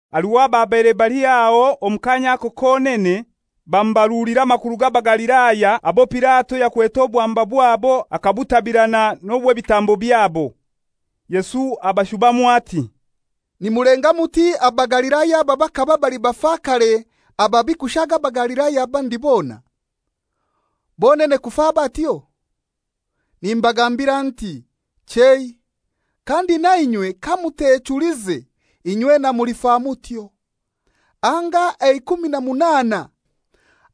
Haliho ababaire baliho aho omu kaanya ako konene, bamubarulira amakuru g'Abagalilaya abo Pilato yakwete obwamba bwabo akabutabirana n'obw'ebitambo byabo. Yesu abashubamu ati, «Nimulenga muti Abagalilaya aba bakaba bali bafakare ababi kushaaga Abagalilaya abandi bona, bonene kufa batyo? Nimbagambira nti, chei; kandi nainywe kamutechulize, inywena mulifa mutyo. Anga eikumi na munaana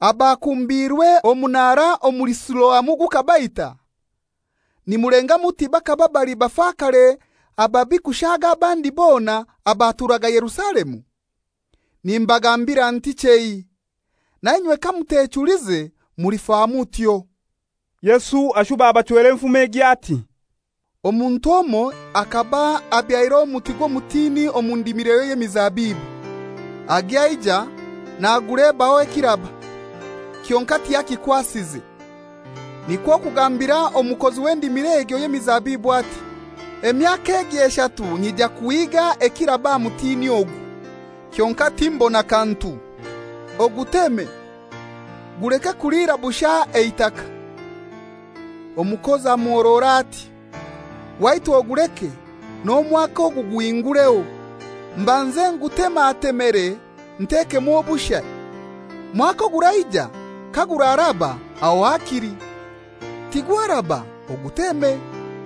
abakumbiirwe omunara omuli Siloamu gukabaita, nimulenga muti bakaba bali bafakare ababi kushaaga abandi bona abaturaga Yerusalemu? Nimbagambira nti, chei. Nainywe kamutechulize mulifa mutyo.» Yesu ashuba abachwera enfumo egi ati, «Omuntu omoi akaba abyaire omuti gw'omutini omu ndimiroye y'emizabibu. Agya aija nagulebaho ekiraba, kyonkai tiyakikwasize. Nikwo kugambira omukozi w'endimiro egyo y'emizabibu ati, ‹Emyaka egi eshatu nyija kuhiiga ekiraba aha mutini ogu, kyonkai timbona kantu. Oguteme, guleke kuliira bushai eitaka.› Omukozi amuhorora ati, ‹Waitu oguleke, n'omwaka ogu guhingureho, mbanze ngutematemere ntekemu obushai. Mwaka oguraija kaguraaraba, aho hakili, tigwaraba, oguteme.›»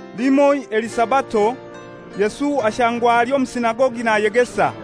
Limoi eli Sabato, Yesu ashangwa ali omu sinagogi nayegesa.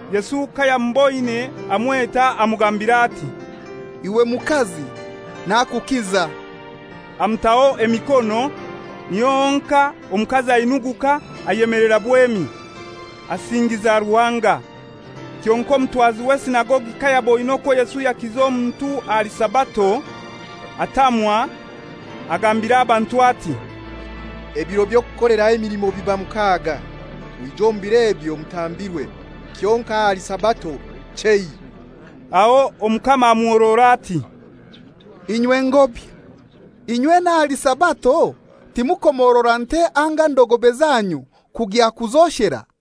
Yesu kayamuboine amweta amugambira ati, «Iwe mukazi, nakukiza.» Amutaho emikono, niho honkai omukazi ainuguka ayemelera bwemi, asingiza Ruhanga. Kyonkai omutwazi w'esinagogi kayaboine okwo Yesu yakiza omuntu ahali Sabato, atamwa, agambira abantu ati, «Ebiro by'okukoleraho emilimo biba mukaga. Mwije omu biro ebyo mutambirwe, kyonkai ahali Sabato, chei.» Aho Omukama amuhorora ati, «Inywe ngobya! Inywena ahali Sabato timukomorora nte anga ndogobe zanyu kugya kuzoshera?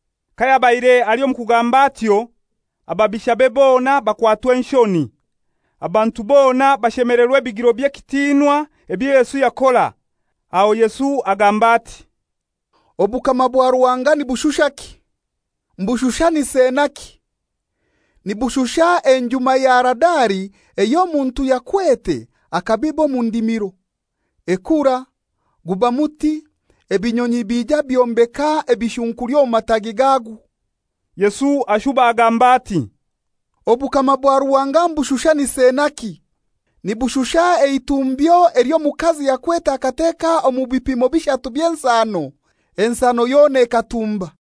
Kayabaire ali omu kugamba atyo, ababishabe bona bakwatwa enshoni. Abantu bona bashemelerwa ebigiro by'ekitinwa ebyo Yesu yakora. Aho Yesu agamba ati, «Obukama bwa Ruhanga nibushushaki? Mbushushanise naki? Nibushusha enjuma ya Haradali ey'omuntu yakwete akabiba omu ndimiro. Ekura, guba muti, ebinyonyi bija byombeka ebishunkuli omu mataagi gagwo.» Yesu ashuba agamba ati, «Obukama bwa Ruhanga mbushushanise naki? Nibushusha eitumbyo ely'omukazi yakwete akateka omu bipimo bishatu by'ensano, ensano yona ekatumba.»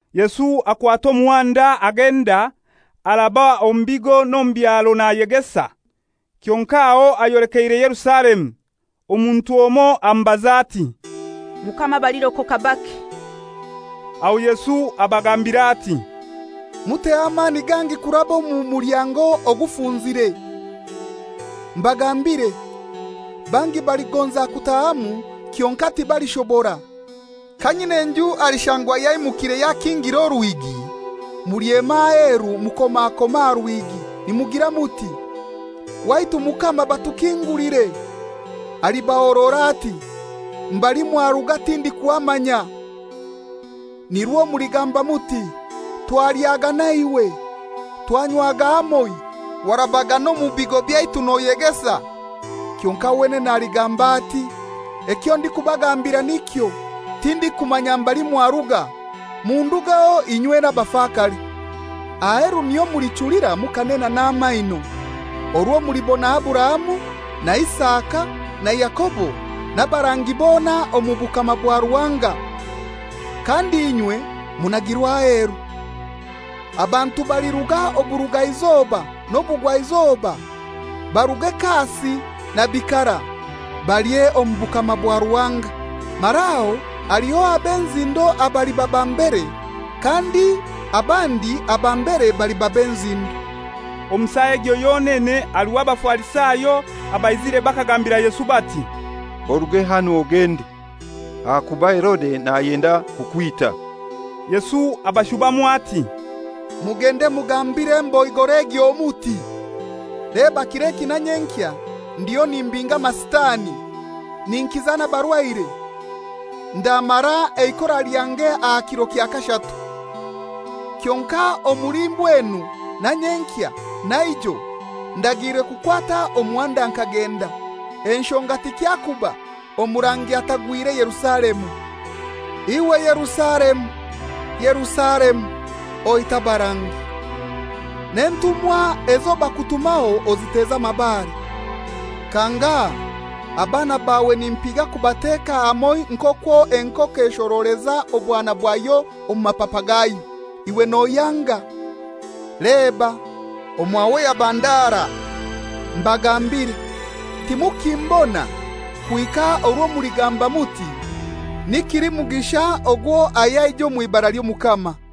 Yesu akwata omuhanda agenda, araba omu bigo n'omu byaro nayegesa, kyonkai aho ayolekeire Yerusalemu. Omuntu omoi amubaza ati, «Mukama, abalirokoka bake?» Aho Yesu abagambira ati, «Muteho amani gangi kuraba omu mulyango ogufunzire. Mbagambire, bangi baligonza kutahamu kyonkai tibalishobora. Kanyin'enju alishangwa yaimukire yakingire orwigi, mulyema aheru mukomakome aha rwigi, nimugira muti, ‹Waitu Mukama batukingulire.› Alibahorora ati, ‹Mbali mwaruga tindikuhamanya.› Nirwo muligamba muti, ‹Twalyaga naiwe, twanywaga hamoi, warabaga n'omu bigo byaitu noyegesa.› Kyonkai wenene aligamba ati, ‹Ekyo ndikubagambira nikyo, tindikumanya mbali mwaruga. Mundugeho inywena abafakare.› Aheru niho mulichulira mukanena n'amaino, orwo mulibona Aburahamu na Isaka na Yakobo n'abarangi bona omu bukama bwa Ruhanga, kandi inywe munagirwe aheru. Abantu baliruga oburugaizoba n'obugwaizoba, baruge kasi na bikara, balye omu bukama bwa Ruhanga. Mara aho haliho ab'enzindo abaliba ba mbere, kandi abandi aba mbere baliba b'enzindo.» Omu saa egyo yonene haliho Abafarisayo abaizire bakagambira Yesu bati, «Oruge hanu ogende, ahakuba Herode nayenda kukwita.» Yesu abashubamu ati, «Mugende mugambire emboigora egyo muti, ‹Leba, kir'eki na nyenkya ndiyo nimbinga amasitani, ninkiza n'abarwaire, ndamara eikora lyange aha kiro kya kashatu. Kyonkai omuli mbwenu na nyenkya na ijo ndagiirwe kukwata omuhanda nkagenda, enshonga tikyakuba, omurangi atagwire Yerusalemu.› «Iwe Yerusalemu, Yerusalemu, oita abarangi, n'entumwa ezo bakutumaho oziteza amabare! Kangahai abaana bawe nimpiga kubateka hamoi nk'okwo enkoko eshoroleza obwana bwayo omu mapapa gayo, iwe noyanga! Leba, omwawe yaba ndara. Mbagambire, timukimbona kuhika orwo muligamba muti, ‹Ni kilimugisha ogwo ayaija omw'ibara ly'Omukama.›»